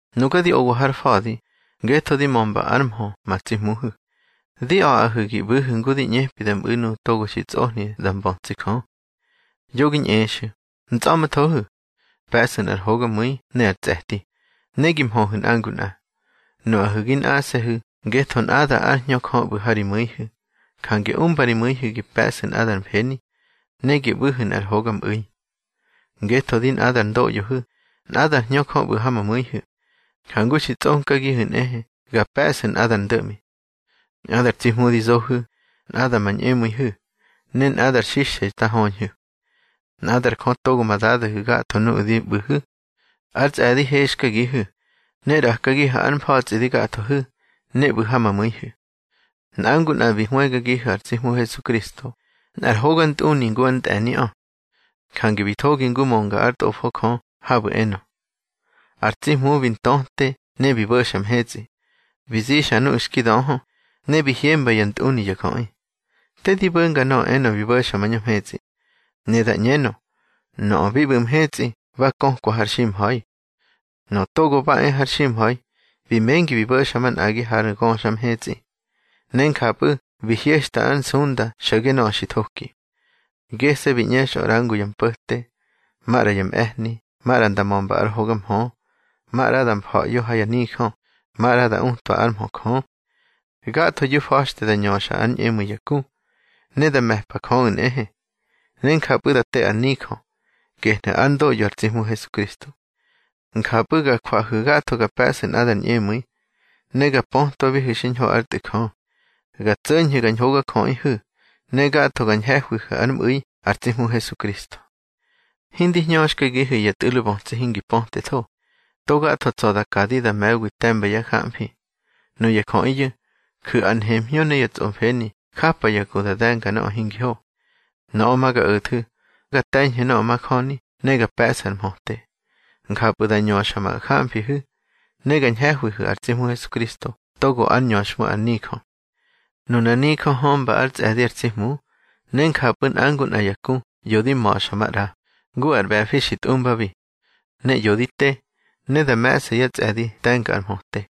Nuga di owa har fa̱di ngetho di mömba ár mhö ma tsi Hmuhu̱, di a̱ꞌahu̱ gi ꞌbu̱hu̱ ngu di ꞌñepi da mꞌu̱ nuꞌu̱ togo xi tsꞌohni da mbötsi Jö. Yo gi ñꞌexu̱, ntsꞌa̱ꞌmthohu̱. Pe̱ꞌsu̱ nꞌar hogamu̱i ne ar tsꞌe̱ti, ne gi mhöhu̱ nꞌa ngu nꞌa. Nuꞌahu̱ gi nꞌase̱hu̱ ngetho nꞌada ár Hñö Jö ꞌbu̱ ha ri mu̱ihu̱. Jange umba ri mu̱ihu̱ gi pe̱ꞌsu̱ nꞌadar mfeni, ne gi ꞌbu̱hu̱ nꞌar hogamꞌu̱i. Ngetho di nꞌadar ndoꞌyohu̱, nꞌadár Hñö Jö ꞌbu̱ ha ma mu̱ihu̱, jangu xi tsꞌonkagihu̱ nꞌehe ga pe̱ꞌsu̱ nꞌadar ndo̱ꞌmi. Nꞌadar tsi Hmu di zohu̱, nꞌada ma ñꞌemu̱ihu̱, ne nꞌadar xixthe xta höñhu̱. Nꞌadar Jö togo ma Dadahu̱ gatho nuꞌu̱ di ꞌbu̱hu̱. Ár tsꞌe̱di hexkagihu̱, ne ꞌrakagihu̱ ár mfa̱tsꞌi di gathohu̱, ne ꞌbu̱ ha ma mu̱ihu̱. Nꞌa ngu nꞌa bi hwëgagihu̱ ar tsi Hmu Hesukristo nꞌar hogantꞌuni ngu ár ntꞌe̱niꞌö. Jange bi thogi ngu mönga ár Tꞌofo Jö habu̱ enö: Ar tsi Hmu bi ntöte ne bi bo̱xa mhetsꞌi, bi zixa nuꞌu̱ xki döhö, ne bi hyemba ya ntꞌuni ya jöꞌi. Te di bo̱nga nöꞌö enö bi bo̱xa mañö mhetsꞌi. Ne da ꞌñenö, nöꞌö mi ꞌbu̱ mhetsꞌi ba kökwa har ximha̱i. Nöꞌö togo ba e har ximha̱i bi mengi bi bo̱xa manꞌagi har ngöxa mhetsꞌi, ne njapꞌu̱ bi hyexta ár nsunda xo̱ge nöꞌö xi thoki. Gese̱ bi ꞌñexꞌö ꞌra ngu yá mpo̱te, maꞌra yá mꞌe̱hni, maꞌra nda mömba ár hoga mhö, maꞌra da mfa̱ꞌyo ha yá nijö, maꞌra da utwa ár mhö Jö. Gathoyu̱ fa̱xte da ñöxa ár ñꞌemu̱i ya ku, ne da me̱pa Jöꞌu̱ nꞌehe. Ne njapꞌu̱ da te ar nijö, gehnu̱ ár ndoꞌyo ar tsi Hmu Hesukristo. Njapꞌu̱ ga jwahu̱ gatho ga pe̱ꞌsu̱ nꞌadar ñꞌemu̱i, ne ga pötwabihu̱ xiñho ár Tꞌu̱ Jö. Ga tso̱ñhu̱ ga ñhogajöꞌihu̱, ne gatho ga ñhe̱hwihu̱ ár mꞌu̱i ar tsi Hmu Hesukristo. Hindi hñöxkagihu̱ ya tꞌu̱lo bötsi hingi pötetho, to gatho tsa̱ da kadi da me̱wi te̱mba yá jamfi. Nuya jöꞌiyu̱ ju̱ ar nhemhñö ne ya tsꞌomfeni japa ya ku da de̱nga nöꞌö hingi ho. Nöꞌö ma ga o̱thu̱, ga te̱ñhu̱ nöꞌö majöni ne ga pe̱ꞌsu̱ ar mhöte. Njapꞌu̱ da ñöxa ma jamfihu̱, ne ga ñhe̱hwihu̱ ar tsi Hmu Hesukristo togo ár ñöxhmu ar nijö. Nunar nijö hömba ár tsꞌe̱di ar tsi Hmu, ne njapꞌu̱ nꞌa ngu nꞌa ya ku ꞌyo di ma̱xa maꞌra, ngu ar ꞌbe̱fi xi tꞌumbabi. Ne ꞌyo di te, ne da me̱ꞌsa yá tsꞌe̱di te̱nga ar mhöte.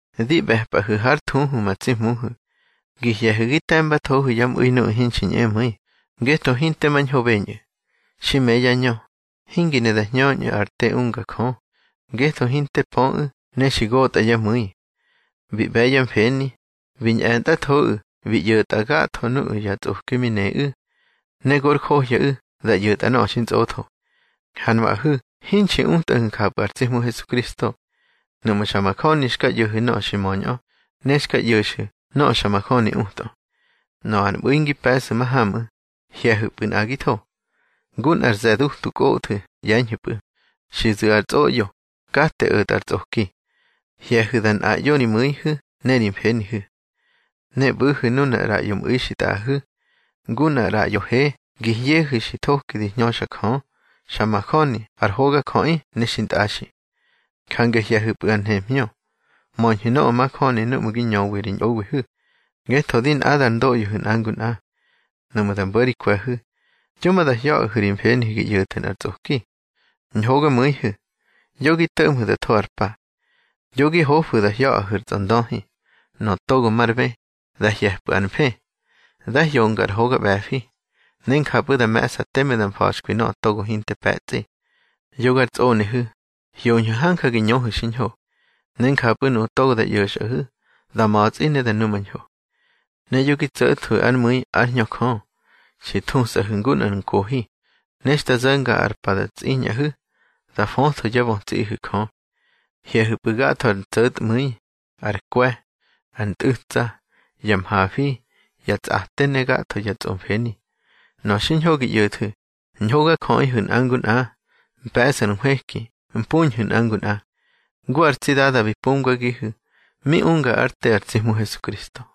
Di ꞌbe̱pꞌahu̱ hár thuhu ma tsi Hmuhu̱, gi hye̱hu̱ gi te̱mbathohu̱ yá mꞌu̱i nuꞌu̱ hinxi ñꞌemu̱i, ngetho hinte mañho beñꞌu̱. Xi me yá ñö, hingi ne da hñöñꞌu̱ ar te unga Jö, ngetho hinte pöꞌu̱ ne xi gotꞌa yá mu̱i. Bi ꞌbe̱ yá mfeni, bi ñꞌe̱ntꞌathoꞌu̱ bi ꞌyo̱tꞌa gatho nuꞌu̱ ya tsꞌoki mi neꞌu̱, ne gor johyaꞌu̱ da ꞌyo̱tꞌa nöꞌö xintsꞌotho. Ha nuꞌahu̱ hinxi utꞌahu̱ njapꞌu̱ ar tsi Hmu Hesukristo, nuꞌmu̱ xa majöni xka ꞌyo̱hu̱ nöꞌö xi möñꞌö, ne xka ꞌyo̱xu̱ nöꞌö xa majöni utꞌö. Nöꞌö ar mꞌu̱i ngi pe̱ꞌsu̱ mahamꞌu̱, hye̱hu̱pꞌu̱ nꞌagitho. Ngu nꞌar ze̱ dutu kꞌothu̱ ꞌye̱ñhu̱pꞌu̱, xi zu̱ ar tsꞌoꞌyo, kate o̱tꞌa ar tsꞌoki. Hye̱hu̱ da nꞌaꞌyo ri mu̱ihu̱ ne ri mfenihu̱. Ne ꞌbu̱hu̱ nunar ꞌraꞌyo mꞌu̱i xi tꞌaꞌahu̱, ngu nꞌar ꞌraꞌyo he gi hyehu̱ xi thoki di hñöxa Jö, xa majöni ar hogajöꞌi ne xintꞌaxi. Jange hye̱hupꞌu̱ ar nhemhñö. Möñhu̱ nöꞌö majöni núꞌmu̱ gi ñöwi ri ñꞌowihu̱, ngetho di nꞌadar ndoꞌyohu̱ nꞌa ngu nꞌa. Nuꞌmu̱ da mbo̱ ri kwe̱hu̱, yo ma da hya̱ꞌahu̱ ri mfenihu̱ gi ꞌyo̱thu̱ nꞌar tsꞌoki. Ñhogamu̱ihu̱, yo gi to̱ꞌmhu̱ da tho ar pa. Yo gi hofu̱ da hya̱ꞌahu̱ ar tsꞌondöhi. Nöꞌö togo mar bë, dá hye̱pꞌu̱ ar mfë. Dá hyonga nꞌar hoga ꞌbe̱fi, ne njapꞌu̱ da me̱ꞌsa teme da mfa̱xkwi nöꞌö togo hinte pe̱tsꞌi. Yogar tsꞌonehu̱, hyoñhu̱ hanja gi ñöhu̱ xiñho, ne njapꞌu̱ nuꞌu̱ togo da ꞌyo̱xꞌahu̱ da ma̱tsꞌi ne da numañho. Ne yo gi tso̱thwu̱ ár mu̱i ár Hñö Jö. Xi thusꞌahu̱ ngu nꞌar nkohi, ne xta zo̱nga ar pa da tsꞌiñꞌahu̱, da fötho yá bötsiꞌihu̱ Jö. Hye̱hu̱pꞌu̱ gatho ar ntso̱tmu̱i, ar kwe̱, ar ntꞌu̱tsa, ya mhafi, ya tsꞌate, ne gatho ya tsꞌomfeni. Nöꞌö xiñho gi ꞌyo̱thu̱, ñhogajöꞌihu̱ nꞌa ngu nꞌa, mpe̱ꞌsu̱ ar nhwëki mpuñhu̱ nꞌa ngu nꞌa, ngu ar tsi Dada bi pumgagihu̱ mi unga ár te ar tsi Hmu Hesukristo.